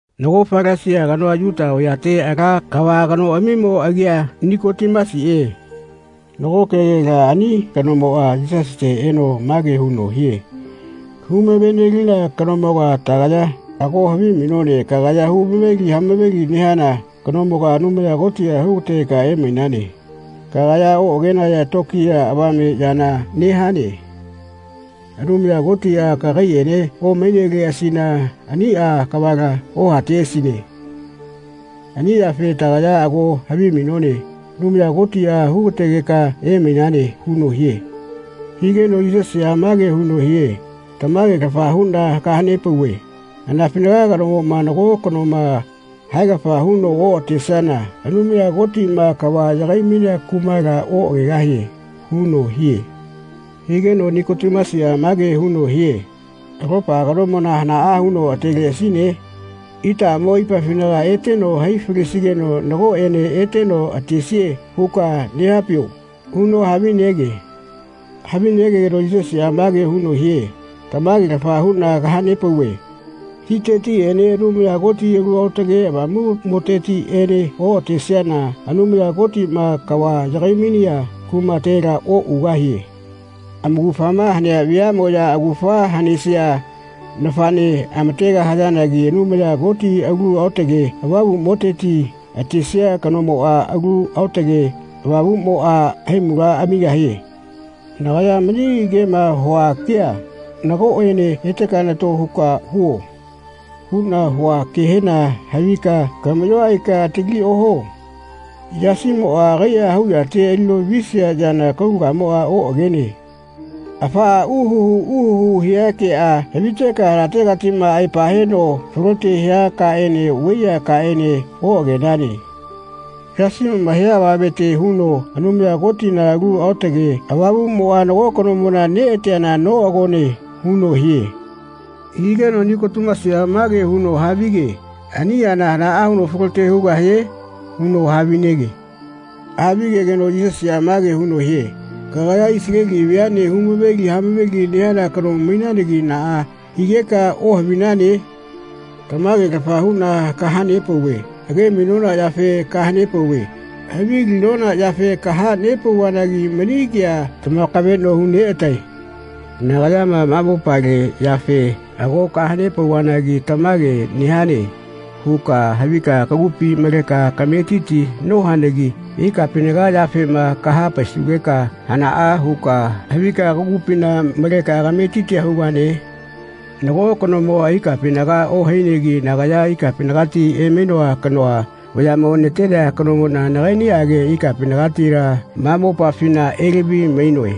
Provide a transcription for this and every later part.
Nago Falasia kanoa Yuta vayate ala kava kanoꞌamimo agia Nikotimasiꞌe. Nago kegela ani kanomoꞌa Yisasite eno mage huno hie “Humave-nelina kanomoga tagaya ago havimainone kagaya humaveli hama-veli nehana kanomoga Anumaya Kotiꞌa hu-gategeka emainane. Kagaya oꞌagenaya tokiya avame yana nehane. Anumaya Kotiꞌa kagaiꞌene omaineleꞌasina aniꞌa kavala ohateꞌasine. Ani yafe tagaya ago havimainone Anumaya Kotiꞌa hu-gategeka emainane.” huno hie. Higeno Yisasiꞌa mage huno hie “Tamage-lafa huꞌna kaha-nepauve anafinaga kanomoꞌma nago kanoma haegafa huno oꞌatesiana Anumaya Kotiꞌma kava yagai-mainea kumala oꞌagegahie.” huno hie. Higeno Nikotimasiꞌa mage huno hie “Alopa kanomona hanaꞌa huno ateleꞌasine? Itaꞌamo aipafinaga eteno hai falesigeno nagoꞌene eteno atesie huka nehapio?” huno havinege. Havigegeno Yisasiꞌa mage huno hie “Tamage-lafa huꞌna kaha-nepauve titetiꞌene Anumaya Koti Alu Aotage Avamuꞌmotetiꞌene oꞌatesiana Anumaya Kotiꞌma kava yagai-mainea kumatela oꞌugahie. Amaugafama hanea veaꞌmoꞌya augafa hanesia nafaꞌne amategahayanagi Anumaya Kotina Alu Aotake Avamuꞌmoteti atesia kanomona Alu Aotage Avamuꞌmoꞌa haimula amigahie. Nagaya mani kema hua kea ‘Nagoꞌene eteka nato huka huo.’ huꞌna hua kehena havika kamaꞌyoa aika atali ohuo. Yasimoꞌa agaiꞌa hau yate alino visia yana kaulagamoꞌa oꞌagene. Afaꞌa uhuhu uhuhu hia keꞌa haviteka hanategatiꞌma aepa heno falote hia kaꞌene vaiyea kaꞌene oꞌagenane. Yasimoꞌma hia avamete huno Anumaya Kotina Alu Aotake Avamuꞌmoꞌa nago kanomona neꞌateana noꞌagone.” huno hie. Higeno Nikotimasiꞌa mage huno havige “Ani yana hanaꞌa huno falote hugahie?” huno havinege. Havigegeno Yisasiꞌa mage huno hie “Kagaya Isaleli veaꞌne hu-maveli hamaveli nehana kano mainanagi naꞌa higeka ohavinane? Tamage-lafa huꞌna kaha-nepauve age-mainona yafe kaha-nepauve havilinona yafe kaha-nepauvanagi mani kea tamakaveꞌno hu-neꞌatae. Nagayama ma mopale yafe ago kaha-nepauvanagi ‘Tamage nehane.’ huka havika kagupi maleka kametiti nohanagi ikapinaga yafema kaha-paisugeka hanaꞌa huka havika kagupina maleka kametitia hugane? Nago kanomoꞌa ikapinaga ohainegi nagaya ikapinagati emainoa kanoa vayaꞌmo natenea kanomoꞌna nagaiꞌniꞌage ikapinagatila ma mopafina elavi-mainoe.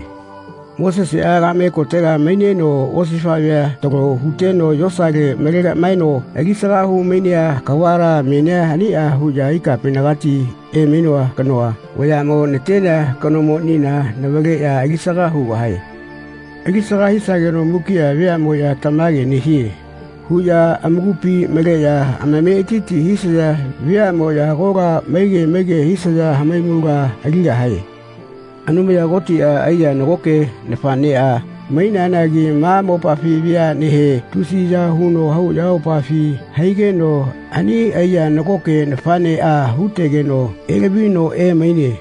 Moseseꞌa kaꞌme kotega maineno osifaꞌvea talo huteno yosale malegaꞌmaeno alisaga hu-mainea kavala menia aniꞌa huꞌya ikapinagati emainoa kanoa vayaꞌmo natenea kanomonina navaleꞌya alisaga hugahae. Alisaga hisageno mukiꞌa veaꞌmoꞌya ‘Tamage nehie.’ huꞌya amakupi maleꞌya amametiti hisaya veaꞌmoꞌya agola maige maige hisaya hamaimula aligahae.” Anumaya Kotiꞌa aiya nagoke nafaꞌneꞌa maineanagi ma mopafi veaꞌnehe tusiya huno hau ayamopafi haigeno ani aiya nagoke nafaꞌneꞌa hu-tegeno elavino emaine.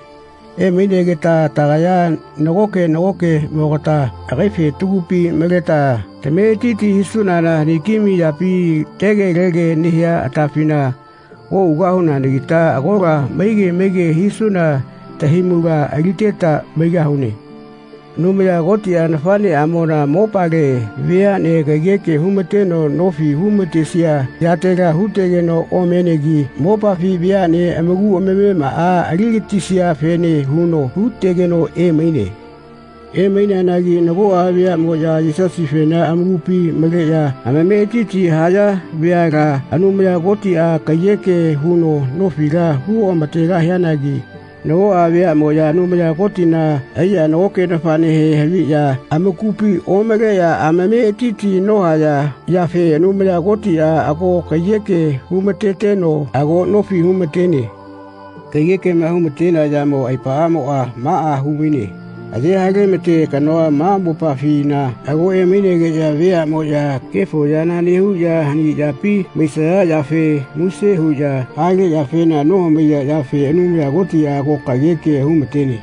Emainegeta tagaya nagoke nagokeꞌmogata agaife tagupi maleta tametiti hisunana haniki-mai yapi tegelege nehia atafina oꞌugahunanagita agola maige maige hisuna tahaimula aliteta maigahune. Anumaya Kotiꞌa nafaꞌneꞌamona mopale veaꞌne kaiyeke hu-mateno nofi hu-matesia yatela hu-tegeno omenegi mopafi veaꞌne amaku amamemaꞌa ali-gatisiafene huno hu-tegeno emaine. Emaineanagi nagoꞌa veaꞌmoꞌya Yesasifena amakupi maleꞌya amametiti haya veala Anumaya Kotiꞌa kaiyeke huno nofila hu oꞌama-tegahianagi nagoꞌa veaꞌmoꞌya Anumaya Kotina aiya nagoke nafaꞌnehe haviꞌya amakupi omaleꞌya amametiti nohaya yafe Anumaya Kotiꞌa ago kaiyeke hu-ma-teteno ago nofi hu-ma-tene. Kaiyekema hu-mate yamo aepaꞌamoꞌa maꞌa hu-maine, aye hale-ma-te kanoa ma mopafina ago emainegeꞌya veaꞌmoꞌya kefo yana nehuꞌya hani yapi maisaya yafe muse huꞌya hale yafena nohamaiya yafe Anumaya Kotiꞌa ago kaiyeke hu-ma-tene.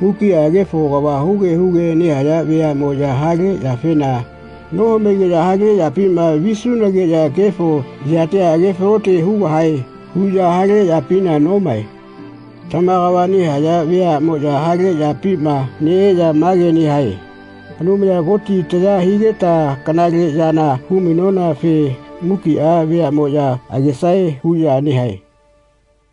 Mukiꞌa kefo kava huge huge nehaya veaꞌmoꞌya hale yafena nohamaigeꞌya “Hale yapima visunageꞌya kefo yatia age-falote hugahae.” huꞌya hale yapina nomae. Tama kava nehaya veaꞌmoꞌya hale yapima neꞌeya mage nehae “Anumaya Kotiꞌa taya higeta kanale yana hu-mainonafe mukiꞌa veaꞌmoꞌya agesae.” huꞌya nehae.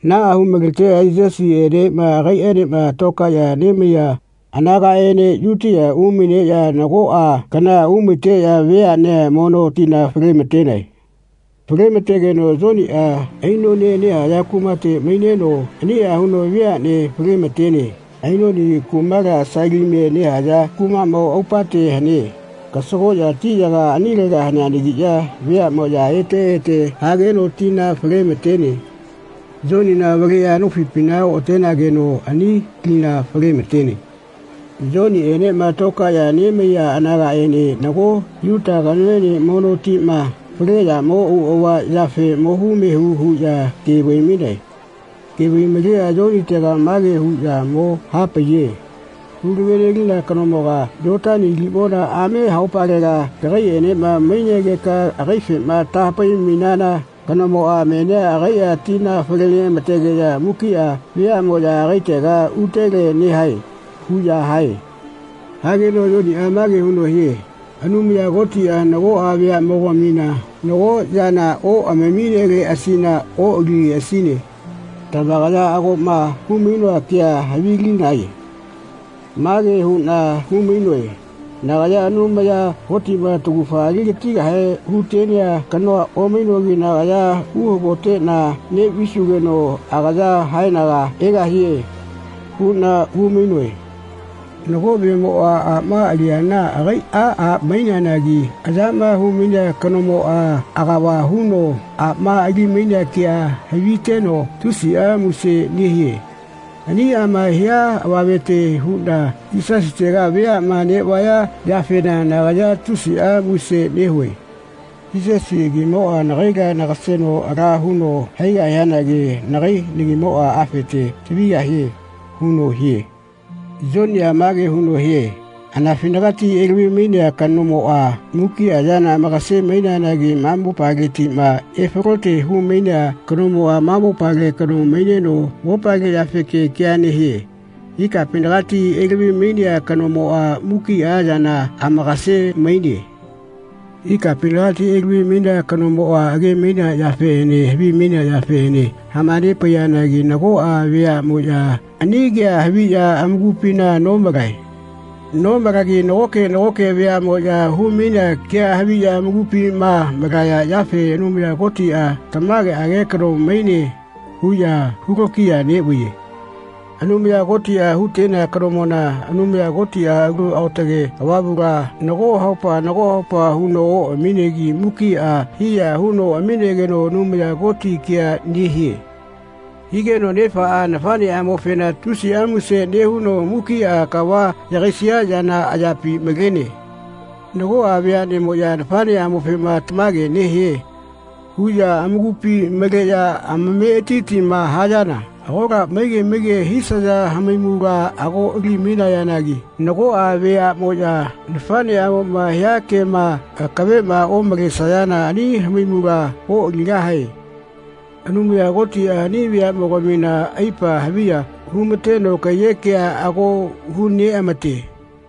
Naꞌa hu-maleteno Yisasiꞌene agaiꞌaenema tokaeꞌya nemaiya anagaꞌene Yutia umaineꞌya nagoꞌa kana umaiteꞌya veaꞌnea mono tina fale-ma-tenae. Fale-ma-tegeno Yoniꞌa Ainonie nehaya kumate maineno aniꞌa huno veaꞌnea fale-ma-tene. Ainoni kumala Salimie nehaya kumaꞌmo aupate hane. Kasagoꞌya tiꞌyaga anilega haneanagiꞌya veaꞌmoꞌya ete ete hageno tina fale-ma-tene. Yonina avaleꞌya nofipina oꞌatenageno ani lina fale-ma-tene. Yonienema tokaeꞌya nemaiya anagaꞌene nago Yuta kanoene mono tima fale yamo auꞌava yafe mohu mehu huꞌya ke vai-mainae. Ke vai-maleꞌya Yonitega mage huꞌya mo hane-paiye “Hulave nelina kanomoga Yotani limona ame haupalega kagaiꞌenema mainegeka agaifema taha-pai-mainana kanomoꞌa menia agaiꞌa tina fale neꞌa-ma-tegeꞌya mukiꞌa veaꞌmoꞌya agaitega utele nehae.” huꞌya hae. Hageno Yoniꞌa mage huno hie “Anumaya Kotiꞌa nagoꞌa veaꞌmogamina nago yana oꞌamamineleꞌasina oꞌalileꞌasine. Tamakaya agoꞌma hu-mainoa kea havilinae. Mage huꞌna hu-mainoe ‘Nagaya Anumaya Kotiꞌma taugafa ali-gatigahe hu-tenea kanoa omainogi nagaya uhagoteꞌna neꞌvisugeno agaya haenaga egahie.’ huꞌna hu-mainoe. Nago vemoꞌa aꞌma aliana agaiꞌa a maineanagi ayama hu-mainea kanomoꞌa agava huno aꞌma ali-mainea kea haviteno tusiꞌa muse nehie. Aniꞌama hia avamete huꞌna Yisasitega veaꞌma neꞌvaya yafena nagaya tusiꞌa muse nehue. Yisasi agimoꞌa nagaila nagaseno ala huno haigahianagi nagai nagimoꞌa afete tavigahie.” huno hie. Yoniꞌa mage huno hie “Anafinagati elavi-mainea kanomoꞌa mukiꞌa yana amakase-maineanagi ma mopaletiꞌma efalote hu-mainea kanomoꞌa ma mopale kano maineno mopale yafeke kea nehie. Ikapinagati elavi-mainea kanomoꞌa mukiꞌa yana amakase-maine. Ikapinagati elavi-mainea kanomoꞌa age-mainea yafeꞌene havimainea yafeꞌene hama-nepaiyanagi nagoꞌa veaꞌmoꞌya ani kea haviꞌya amakupina nomalae. Nomalagi nagoke nagoke veaꞌmoꞌya hu-mainea kea haviꞌya amakupima malaya yafe ‘Anumaya Kotiꞌa tamageꞌage kano maine.’ huꞌya hu-lokiya neꞌvaiye. Anumaya Kotiꞌa hu-tenea kanomona Anumaya Kotiꞌa Alu Aotage Avamula nago haupa nago haupa huno oꞌaminegi mukiꞌa hiya huno aminegeno Anumaya Koti kea nehie. Higeno nefaꞌa nafaꞌneꞌamofena tusiꞌa muse nehuno mukiꞌa kava yagaisia yana ayapi malene. Nagoꞌa veaꞌnemoꞌya nafaꞌneꞌamofema ‘Tamage nehie.’ huꞌya amakupi maleꞌya amametitima hayana agola maige maige hisaya hamaimula ago ali-mainayanagi nagoꞌa veaꞌmoꞌya nafaꞌneꞌamoꞌma hia kema akaveꞌma omalesayana ani hamaimula oꞌaligahae. Anumaya Kotiꞌa ani veaꞌmogamina aipa haviya hu-mateno kaiyeꞌkea ago hu-neꞌamate.”